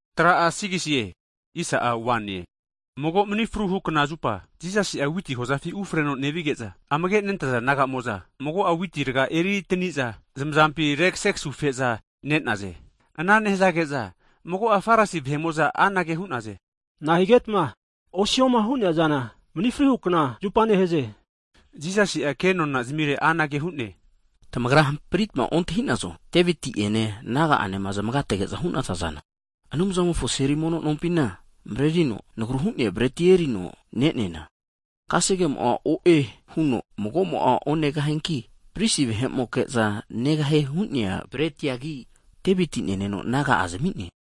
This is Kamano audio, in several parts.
Hagi mago mani fruhu kna (Sabat) zupa Jisasi'a witi hozafi ufreno nevige'za, amage nentaza disaipol naga'amo'za mago'a witi raga eritaniza, zamazampi arekasegasufe'za ne'naze. Ana nehazage'za mago'a Farisi vahe'mo'za anage hu'naze, nahigetma osihoma hu'neazana mani fruhukna (Sabat) zupa nehaze? Jisasi'a kenona zamire anage hu'ne, Tamagra hampritma ontahi'nazo, Deviti'ene, naga'anema, zamagategenoma hu'nea zana? Anumzamofo seli mono nompina marerino, nagru hu'nea breti erino ne'neana, kasegemo'a o'e huno magomo'a onegahianki, pristi vahe'moke'za negahie hu'nea bretiagi, Deviti'a neneno naga'a zami'ne.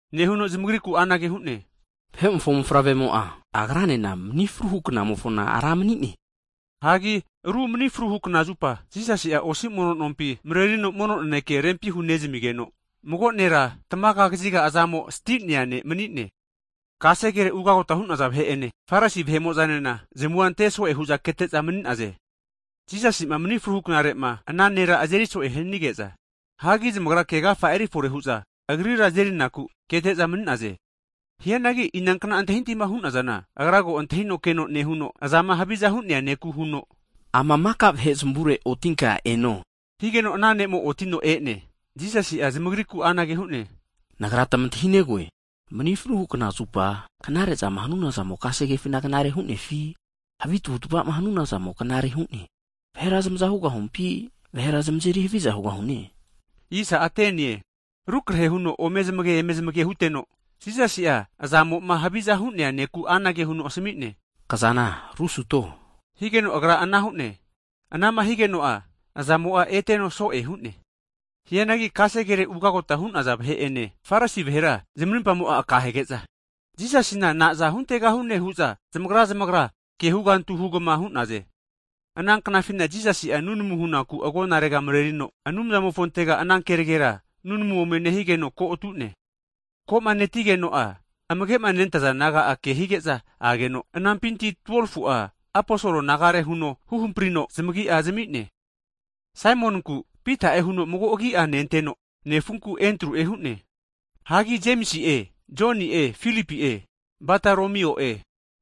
Nehuno zamagriku anage hu'ne, Vahemofo Mofavremo'a, Agranena mani fruhu knamofona (Sabat) Ra mani'ne. Hagi ru mani fruhu kna zupa (sabat) Jisasi'a osi mono nompi (sinagok) marerino mono naneke rempi hu'nezamigeno, mago nera tamaga kaziga azamo'a sti'nea ne' mani'ne. Kasegere ugagota hu'naza vahe'ene, Farisi vahe'mo'zanena, zamua ante'soe hu'za kete'za mani'naze. Jisasima mani fru knarema ana nera azeri'soe hanige'za, hagi zamagra kegafa erifore hu'za Agrira azerinaku, kete'za mani'naze. Hianagi inankna antahintahima hu'nazana, Agra ko antahino keno nehuno, azama haviza hu'nea neku huno, Ama maka vahe zamavure otinka eno! Higeno ana ne'mo'a otino e'ne. Jisasi'a zamagriku anage hu'ne, Nagra tmantahinegoe, mani fruhukna (Sabat) zupa knare zama hanuna zamo kasegefina knarera hunefi, havi tavutavama hanuna zamo knarera hu'ne? Vahera zamaza hugahumpi, vahera zamazeri haviza hugahune? Arukrahe huno ome zamagege, eme zamagema huteno Jisasi'a azamo'ma stinea ne'ku anage huno asami'ne, Kazana arusuto! Higeno agra ana hu'ne. Anama higeno'a, azamo'a eteno so'e hu'ne. Hianagi kasegere ugagota hu'naza vahe'ene, Farisi vahera zamarimpamo'a aka hege'za, Jisasina naza huntegahune hu'za zamagra zamagra kehugantu hugama hu'naze. Ananknafina Jisasi'a nunamu hunaku agonarega marerino, Anumzamofontega ana kenegera nunamu ome nehigeno ko atune. Ko'ma netigeno'a amagema nentaza disaipol naga'a kehige'za ageno, anampinti 12fu'a aposolo nagare huno huhamprino, zamagi'a zami'ne. Saimoninku Pita'e huno mago agi'a nenteno, nefunku Endru'e hu'ne. Hagi Jemisi'e, Joni'e, Filipi'e, Bataromio'e.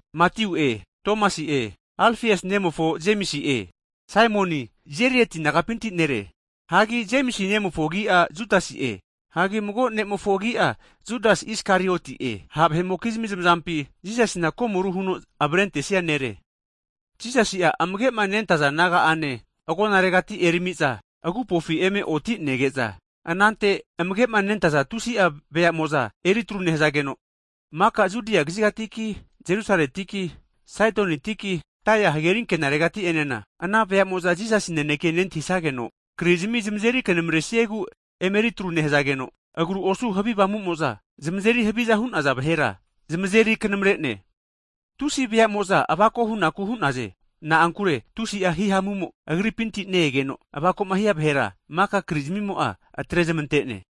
Matiu'e Tomasi'e, Alfiasi nemofo Jemisi'e, Saimoni Zelati nagapinti nere. Hanki Jemisi nemofo agi'a Judasi'e. Hagi mago ne'mofo agi'a Judas Isakarioti'e, ha' vahe'mokizami zamazampi Jisasina komoru huno avarentesia nere. Jisasi'a amage'ma nentaza disaipol naga'ane agonaregati erami'za agupofi eme otinege'za, anante amage'ma nentaza tusi'a disaipol veamo'za eritru nehazageno, maka Judia kazigatiki Jerusaletiki, Saitonitiki, Tairi hageri ankena regati'enena, ana vea'mo'za Jisasi naneke nentahisageno krizimi zamazeri knamresiegu emeri atru nehazageno, agru osu havi avamumo'za zamazeri haviza hu'naza vahera zamazeri knamare'ne. Hagi tusi veamo'za avako hunaku hu'naze. Na'ankure tusi'a hihamumo Agripinti ne-egeno, avako'ma hia vahera maka krizmimo'a atrezmante'ne.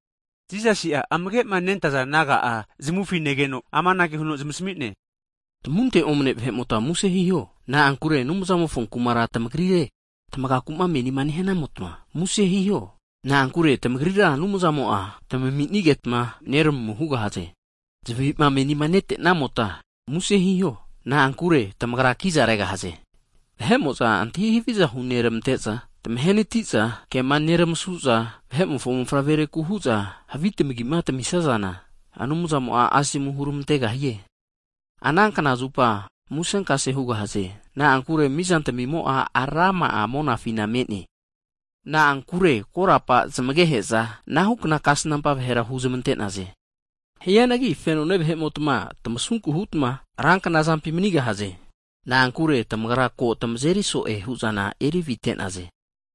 Jisasi'a amage'ma nentaza disaipol naga'a zamufi nezmageno, amanage huno zamasami'ne, Tamamunte omane vahe'mota muse hiho. Na'ankure Anumzamofo Kumara tamagrire. Tamagaku'ma menina nehanamota, muse hiho. Na'ankure tamagrira Anumzamo'a tamaminigetma neramu hugahaze. Zavi'ma menima netenamota muse hiho. Na'ankure tamagra kiza regahaze. Vahe'moza antahi haviza huneramante'za, tamahenati'za, kema neramasu'za, Vahe'mofo Mofavrereku hu'za havi tamagima tamisazana! Anumzamo'a asomu huramantegahie. Ana knazupa musenkase hugahaze. Na'ankure mizantimimo'a rama'a monafina me'ne. Na'ankure korapa zmagehe'za anahukna kasnampa vahera huzmante'naze. Hianagi fenone vahe'mota tmasunku hutma ranknazampi manigahaze. Na'ankure tamagra ko tamazeri so'e hu'zana erivite'naze.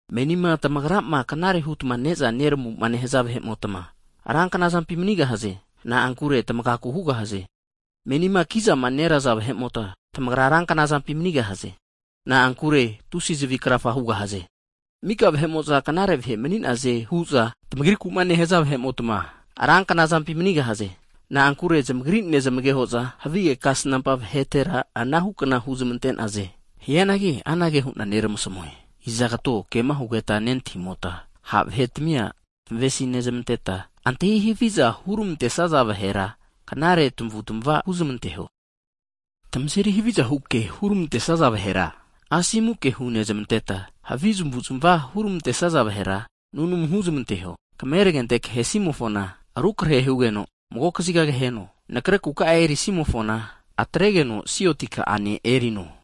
Menima tamagrama knare hutma ne'za neramu nehaza vahe'motma ranknazampi manigahaze. Na'ankure tmagaku hugahaze. Menima kizama neraza vahe'mota, tamagra ranknazampi manigahaze. Na'ankure tusi zavi krafa hugahaze. Mika vahe'mo'za knare vahe mani'naze hu'za tmagriku'ma nehaza vahe'mota ranknazampi manigahaze. Na'ankure zamagri nezmageho'za havige kasnampa vahetera anahukna huzmante'naze. Hianagi anage hu'na neramasamue, izagato kema hugeta nentahimota, ha' vahetamia zamamesi nezmanteta, antahi haviza huneramantesaza vahera, knare tamavutmava huzmanteho. Tamazeri havizahu ke huramantesaza vahera, asomu ke hunezmanteta, havi zamavu'zmava huramantesaza vahera nunamu huzmanteho. Kameragente kahesimofona, rukrahe hugeno mago kaziga kameragente kaheno. Nakre kuka'a erisimofona, atregeno sioti ka'ane erino.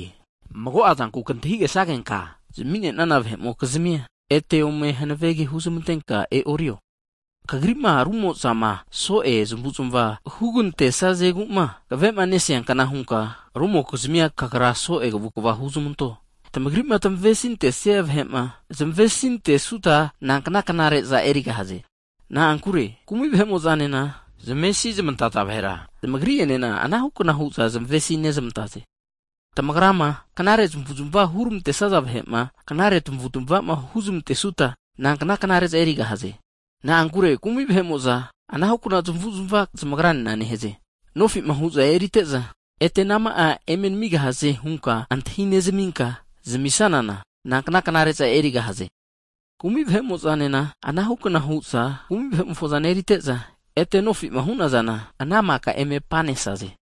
Mago'a zanku kantahi'gesagenka zami'nenana vahe'mokizmia, ete ome hanavege huzmantenka e'orio. Kagri'ma rumo'zama so'e zmuzma hugantesazegu'ma kave'nesiankna hunka rumokizmia, kagra so'e kavukva huzmanto. Tamagri'ma tamesintesia vahe'ma, zamesi zmantesuta, nankna knare'za erigahaze? Na'ankure kumi' vahe'mo'zanena, zmesizmantaza vahera zamagri'enena anahukna hu'za zmesi nezmantaze. Tamagrama, knare zamavuzmava huramantesaza vahe'ma, knare tamavutmava huzmentesuta, nankna knare'za erigahaze? Na'ankure kumi vahe'mo'za anahukna zmavuzmava zamagranena nehaze. Nofi'ma hu'za erite'za, ete anama'a eme tamigahaze huta antahi nezamita zamisazana, nankna knare'za erigahaze? Kumi' vahe'mo'zanena anahukna hu'za kumi vahe'mokizmia fozana erite'za, ete nofima hu'nazana ana maka eme apanesaze.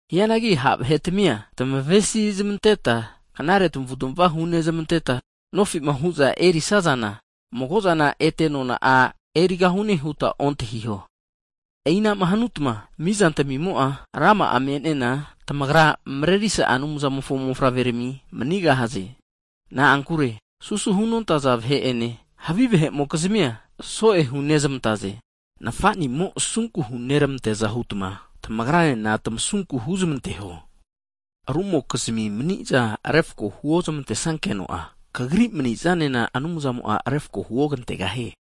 Hianagi ha' vahe tamia tamavesinezmanteta knare tamavutmava hunezmanteta nofi'ma hu'za erisazana mago'zana ete nona'a erigahune huta ontahiho. E'i'nama hanuta mizantamimo'a rama'a me'nena, tamagra Marerisa Anumzamofo mofavrerami manigahaze. Na'ankure susu hunontaza vahe'ene, havi vahe'mokizmia so'e hunezmante. Nafatmimo'ma asunku hunermanteaza hutma, tamagranena tamasunku huzmanteho. Hagi rumokizmi mani'zama refako'ma huozmantesageno'a, tamagri mani'zanena Anumzamo'a refako huoramantegahie.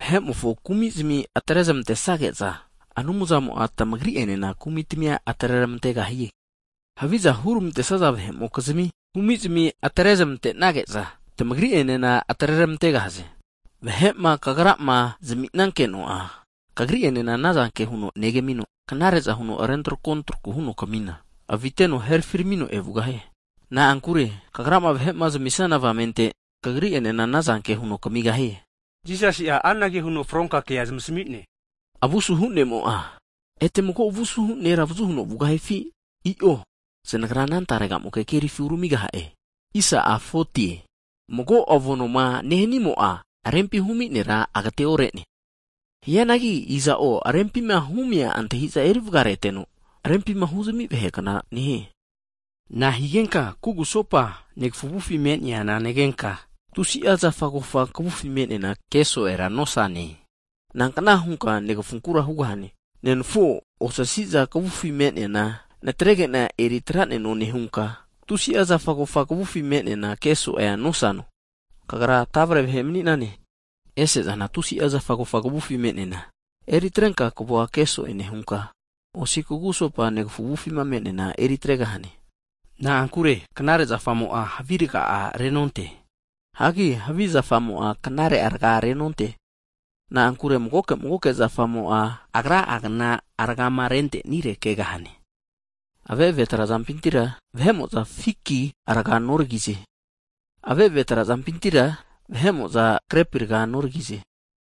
Hagi Vahe'mofo kumi'zmi atrezmantesnageno'a Anumzamo'a tamagri'enena kumitamia atreramantegahie. Haviza huramantesaza vahe'mokizmia kumizmi atrezmante'nage'za tamagri'enena atreramantegahaze. Vahe'ma tamagrama zaminageno'a tamagri'enena anazanke huno Anumzamo'a neramino, knare'za huno rentrako traku huno tamamina, aviteno herafiramino evugahie. Na'ankure tamagrama vahe'ma zamisnaza avamente, tamagri'enena anazanke huno tamigahie. Jisasi'a anage huno fronka kea zamasami'ne. Avu asuhu ne'mo'a, ete mago avu asuhu nera avazu huno vugahifi? I'o zanagra ana taregamoke kerifi uramigaha'e. Mago avo noma nehimo'a, rempima humi nera agateore'ne. Hianagi iza'o rempima humia antahiza eri vagareteno rempima huzami vahekna nehie. Na'a higenka kugusopa negafu avufima me'neana negenka, tusi'a zafa kofa kavufima me'neana ke'so'e nosane? Nankna hunka negafunkura, nenafuo osasi'za kavufima me'neana natregena eri atraneno nehunka, tusi'a zafa kofa kavufi me'neana ke so'e nosano? Kagra tavre vahe mani'nane! Ese'zana tusi'a zafa kofa kavufi me'neana eri atrenka, kavua ke so'e nehunka, osi kugusopa negafu avufi me'neana eritregahane. Na'ankure knare zafamo'a havi raga'a renonte. Hagi havi zafamo'a knare raga renonte. Na'ankure magoke magoke zafamo'a agra'a gna rgama rentenire kegahane. Ave'ave trazampintira vahe'mo'za fiki raga noragize. Ave'ave trazampintira vahe'mo'za krepi raga noragize.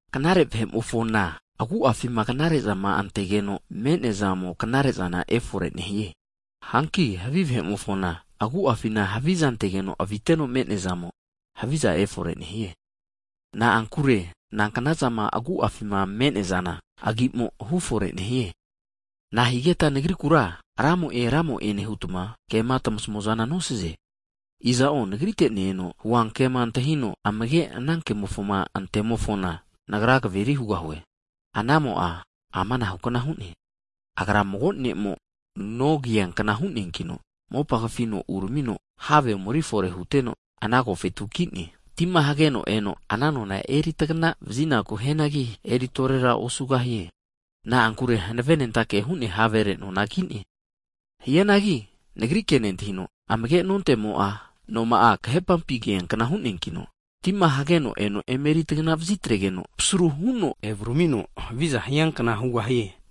Knare vahe'mofona agu'afima knare'zama antegeno me'neazamo, knare'zana efore nehie. Hanki havi vahe'mofona agu'afina haviza antegeno aviteno me'neazamo, haviza efore nehie. Na'ankure nanknazama agu'afima me'neazana, agi'mo hufore nehie. Nahigeta Nagrikura, Ramo'e Ramo'e nehutma, kema tmasamuazana nosaze? Iza'o Nagrite ne-eno huankema antahino amage' anankemofo ante'mofona, Nagra kaveri hugahue. Ana'mo'a ama anahu'kna hu'ne. Agra mago ne'mo'ma noma kiankna hu'neankino, mopa kafino uramino have omeri fore huteno, ana agofetu ki'ne. Tima hageno eno ana nona eritagana vazinaku hianagi, eri torera osugahie. Na'ankure hanave nentake hu'nea havere nona ki'ne. Hianagi Nagri kema nentahino amagenonte'mo'a, noma azeri hanaveti trara onteneno kahepampi noma kiankna hu'neankino tima hageno eno emeri tagana vazitregeno, pasaru huno evu ramino haviza hiankna hugahie.